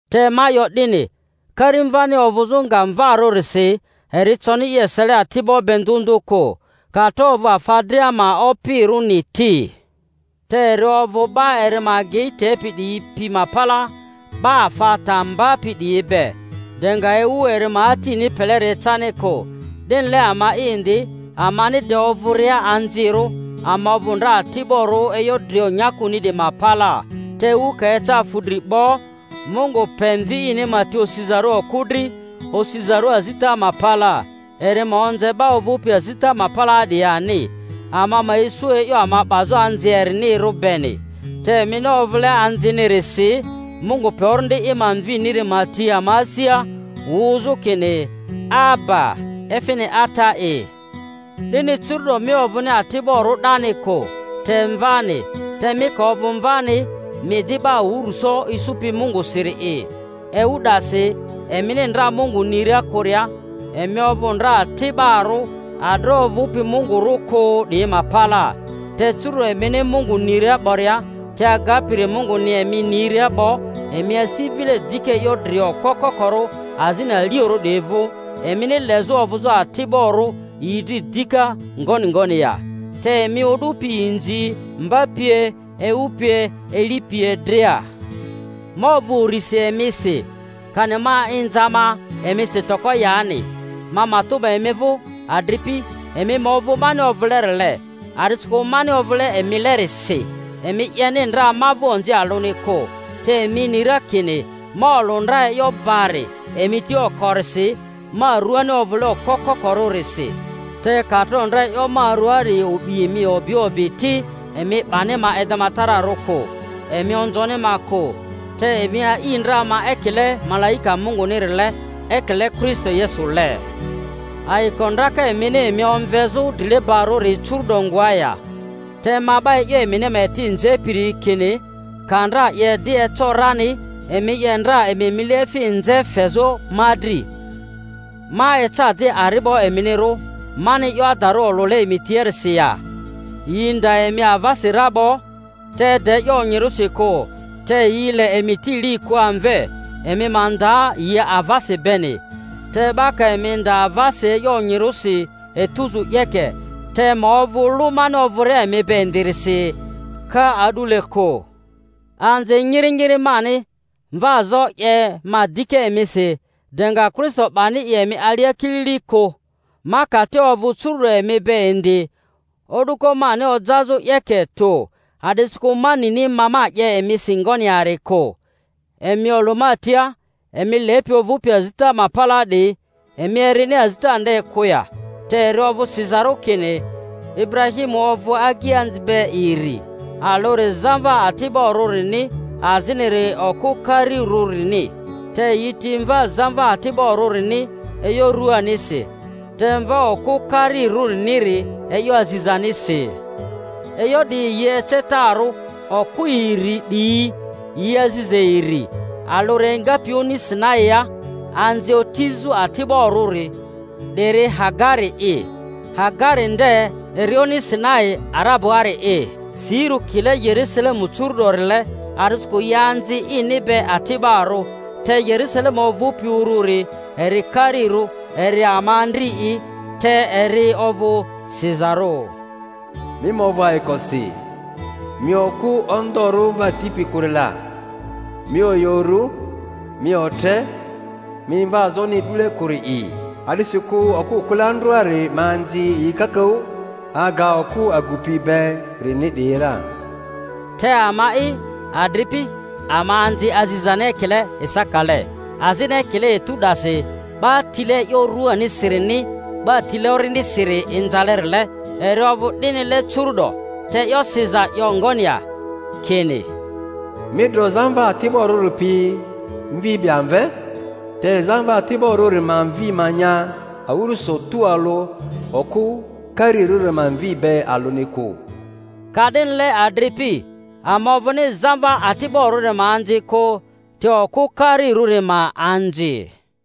Te ma 'yo 'dini, karimvani ovᴜzᴜ nga mvarᴜrisi eri coni i esele ati'bo be ndᴜ ndᴜ kᴜ, ka tro ovᴜ afa dria ma opirᴜni ti; te eri ovᴜ 'ba eri ma agei tepi 'diyi pi ma palaa 'ba afa ta mbapi 'diyi be, de nga ewu eri ma atini peleri ecani kᴜ. 'Dinile ama'i indi, amani de ovᴜria anzirᴜ ama ovᴜ ndra ati'borᴜ e'yo drio nyakuni 'diyi ma palaa. Te ewu ka eca fu dri 'bo, Mungu pe Mvi ini ma ti osizarᴜ okᴜ dri, osizarᴜ azita ma palaa, eri ma onze 'ba ovᴜpi azita ma palaa 'diyi ani, ama ma isu e'yo ama 'bazᴜ anzi erinirᴜri beni. Te emini ovᴜle anzinirisi, Mungu pe Orindi i ma Mviniri ma ti ama asia, wᴜzᴜ kini, Aba, efini Ata'i. 'Dini curu'do mi ovᴜni ati'borᴜ 'dani kᴜ, te mvani; te mi ka ovᴜ mvani, mi di 'ba awᴜrᴜso isupi Mungusiri'i. Ewu 'dasi emini ndra Mungu niria kᴜria, emi ovᴜ ndra ati'barᴜ adroᴜ ovᴜpi mungurᴜ kᴜ 'diyi ma palaa; te curu'do emini Mungu niria 'boria, te agapiri Munguni emi niria 'bo, emi asi vile dika e'yo drio okpo kokorᴜ azini aliorᴜ 'diyi vᴜ, emini lezᴜ ovᴜzᴜ ati'borᴜ yi dri dika, ngoni ngoni ya? Te emi o'du pi inzi, mba pie, ewu pie, eli pie dria! Ma ovᴜ urisi emisi, kani ma inza ma emisi toko yani. Ma matᴜ 'ba emi vᴜ, adripi, emi ma ovᴜ mani ovᴜlerile, a'disikᴜ mani ovᴜle emilerisi. Emi 'yeni ndra ma vᴜ onzi alᴜni kᴜ; te emi ni ra kini ma olᴜ ndra e'yo bari emi tia okorisi ma ruani ovᴜle okpo koko-rᴜrisi; te ka tro ndra e'yo ma ruaari o'bi emi o'bi o'bi ti, emi 'bani ma edematararᴜ kᴜ, emi onzoni ma kᴜ, te emi a'i ndra ma ekile malaika Mungunirile, ekile Kristo Yesule. Ayiko ndraka emini emi omvezᴜ drilebarᴜri curu'do ngoa ya? Te ma 'ba e'yo emini ma eti nzepiri kini, ka ndra 'ye 'di eco rani, emi 'ye ndra emi mileefi nze fezᴜ ma dri. Ma eca di ari'bo eminirᴜ, mani e'yo adari olᴜle emi tiarisi ya? Yi nda emi avasi ra 'bo, te de e'yo onyirᴜsi kᴜ; te yi le emi ti li kᴜ amve, emi ma nda yi avasi beni. Te 'ba ka emi nda avasi e'yo onyirᴜsi etuzu 'yeke, te ma ovᴜ lᴜ mani ovᴜria emi be indirisi ka a'dule kᴜ. Anzi nyiri nyiri mani, mvaazo 'ye ma dika emisi de nga Kristo 'bani i emi alia kilili kᴜ! Ma ka te ovᴜ curu'do emi be indi, o'duko mani ojazᴜ, 'yeke tᴜ, a'disikᴜ ma nini ma ma 'ye emisi ngoni yari kᴜ. Emi olᴜ ma tia, emi lepi ovᴜpi azita ma palaa 'diyi, emi erini azita nde kᴜ ya? Te eri ovᴜ sizarᴜ kini Iburahimu ovᴜ agianzi be iri, alᴜri zamva ati'borᴜrini, aziniri okᴜ karirᴜrini. Te yi ti mva zamva ati'borᴜrini e'yo ruanisi, te mva okᴜ karirᴜriniri e'yo azizanisi. E'yo 'diyi yi ecetarᴜ: okᴜ iri 'diyi yi aziza iri. Alᴜri engapi oni Sinaia, anzi otizᴜ ati'barᴜri; 'diri Hagari'i. Hagari nde eri oni Sinai Ara-buaari'i; sirᴜ kile Yerusalemu curu-'dorile, a'disikᴜ yi anzi ini be ati'barᴜ. Te Yerusalemu ovᴜpi ururi eri karirᴜ, eri ama andri'i. Te eri ovᴜ sizarᴜ, Mi ma ovᴜ ayikosi, mi okᴜ ondorᴜ mva tipi kᴜri la; mi oyᴜ uru, mi otre, mi mvaazoni e'dule kᴜri'i; a'disikᴜ okᴜ kᴜle andrᴜari ma anzi yi kakaᴜ aga okᴜ agupi berini 'diyi ra. Te ama'i, adripi, ama anzi azizani ekile Isakale. Azini ekile etu 'dasi 'ba tile e'yo ruanisirini 'ba tile Orindisiri inzalerile, eri ovᴜ 'dinile curu'do. Te e'yo siza 'yo ngoni ya? Kini, Mi dro zamva ati'borᴜri pi mvi be amve; te zamva ati'borᴜri ma mvi ma nya awᴜrᴜso tualᴜ okᴜ karirᴜri ma mvi be alᴜni kᴜ. Ka'dinile, adripi, ama ovᴜni zamva ati'borᴜri ma anzi kᴜ, te okᴜ karirᴜri ma anzi.